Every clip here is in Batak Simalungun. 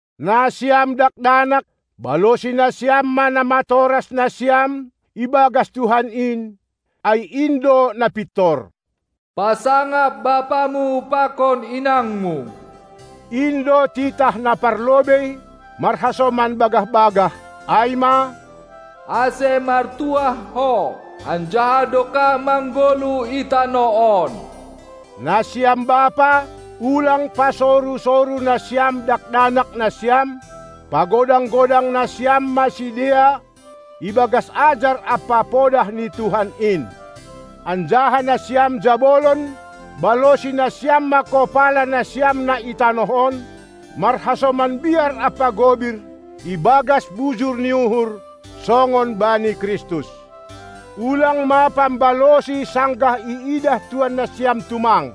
Nasiam dakdanak, balosi nasiam ma namatoras nasiam ibagas Tuhan in, ai in do na pintor. "Pasangap bapamu pakon inangmu!" in do titah na parlobei marhasoman bagah-bagah, ai ma, "ase martuah ho anjaha dokah manggoluh i tanoh on!" Nasiam bapa, ulang pasoru-soru nasiam dakdanak nasiam; pagodang-godang nasiam ma sidea ibagas ajar ampa podah ni Tuhan in! Anjaha nasiam jabolon, balosi nasiam ma kopala nasiam na i tanoh on, marhasoman biar ampa gobir, ibagas bujur ni uhur, songon bani Kristus. Ulang ma pambalosi sanggah iidah tuan nasiam tumang,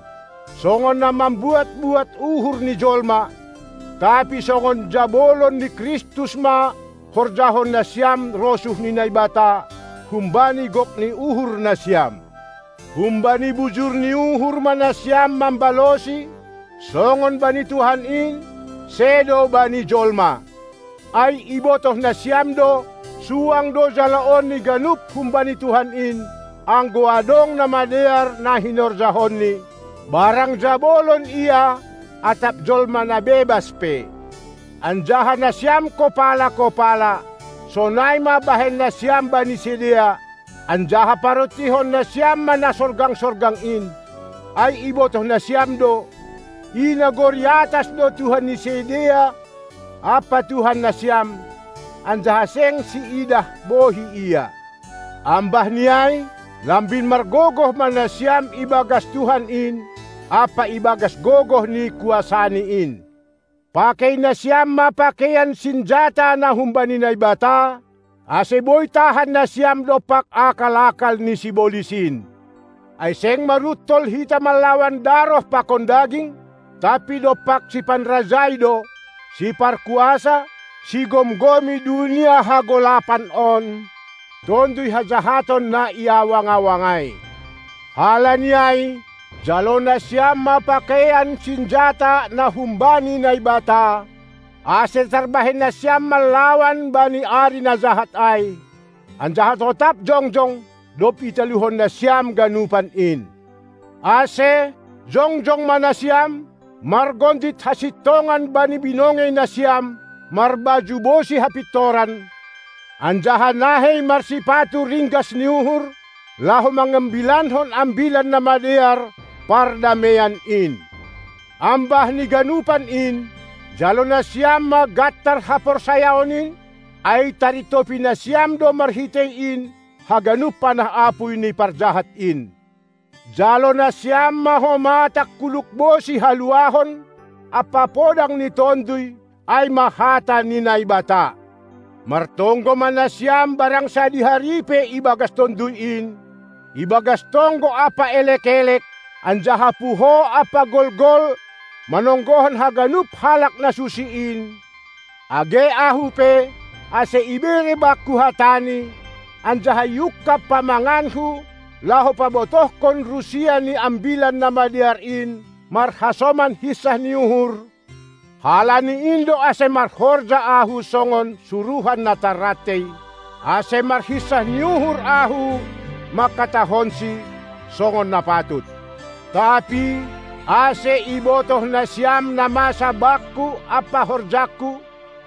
songon na mambuat-buat uhur ni jolma, tapi songon jabolon ni Kristus ma horjahon nasiam rosuh ni Naibata, humbani gok ni uhur nasiam. Humbani bujur ni uhur ma nasiam mambalosi, songon bani Tuhan in, sedo bani jolma. Ai ibotoh nasiam do, suang do jaloon ni ganup humbani Tuhan in, anggo adong na madear na hinorjahonni, barang jabolon ia atap jolma na bebas pe. Anjaha nasiam kopala-kopala, sonai ma bahen nasiam bani sidea, anjaha parontihon nasiam ma na sorgang-sorgang in, ai ibotoh nasiam do, i nagori atas do Tuhan ni sidea ampa Tuhan nasiam, anjaha seng siidah bohi Ia. Ambahni ai, Lambin margogoh ma nasiam ibagas Tuhan in ampa ibagas gogoh ni kuasaNi in. Pakei nasiam ma pakeian sinjata na humbani Naibata, ase boi tahan nasiam dompak akal-akal ni sibolis in. Ai seng maruntol hita manlawan daroh pakon daging, tapi dompak sipanrajai do, siparkuasa, sigomgomi dunia hagolapan on, tonduy hajahaton na i awang-awang ai. Halani ai, jalo nasiam ma pakeian sinjata na humbani Naibata, ase tarbahen nasiam manlawan bani ari na jahat ai, anjaha totap jongjong, dob italuhon nasiam ganupan in. Ase, jongjong ma nasiam, margondit hasintongan bani binongei nasiam, marbaju bosi hapintoran, anjaha nahei marsipatu ringgas ni uhur, laho mangambilankon Ambilan Namadear, pardameian in. Ambah ni ganupan in, jalo nasiam ma gantar haporsayaon in, ai tarintopi nasiam do marhitei in haganup panah apuy ni parjahat in. Jalo nasiam ma homa tangkuluk bosi haluahon ampa podang ni tonduy, ai ma hata ni Naibata. Martonggo ma nasiam barang sadihari pe ibagas Tonduy in, ibagas tonggo ampa elek-elek, anjaha puho ampa golgol manonggohon haganup halak na susi in, age ahu pe, ase ibere bakku hatani, anjaha iungkab pamanganku laho pabotohkon rusia ni Ambilan Namadear in marhasoman hinsah ni uhur, (halani in do ase marhorja ahu songon suruhan na tarrantei), ase marhinsah ni uhur ahu manghatahonsi, songon na patut. Tapi, ase ibotoh nasiam na masa bakku ampa horjangku,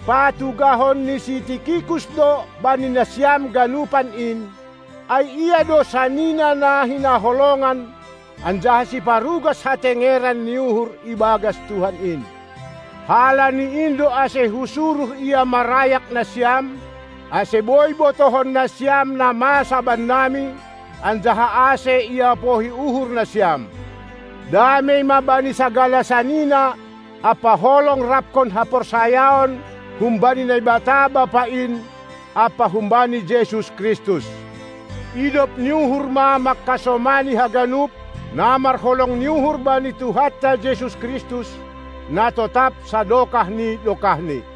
patugahon ni si Tikikus do bani nasiam ganupan in, ai ia do sanina na hinaholongan anjaha siparugas hatengeran ni uhur ibagas Tuhan in. Halani in do ase husuruh ia marayak nasiam, ase boi botohon nasiam na masa bannami, anjaha ase iapohi uhur nasiam. Damei ma bani sagala sanina ampa holong raphon haporsayaon humbani Naibata Bapa in ampa humbani Jesus Kristus. Idop ni uhur ma manghasomani haganup, na marholong ni uhur bani Tuhanta Jesus Kristus, na totap sadokah ni dokahni.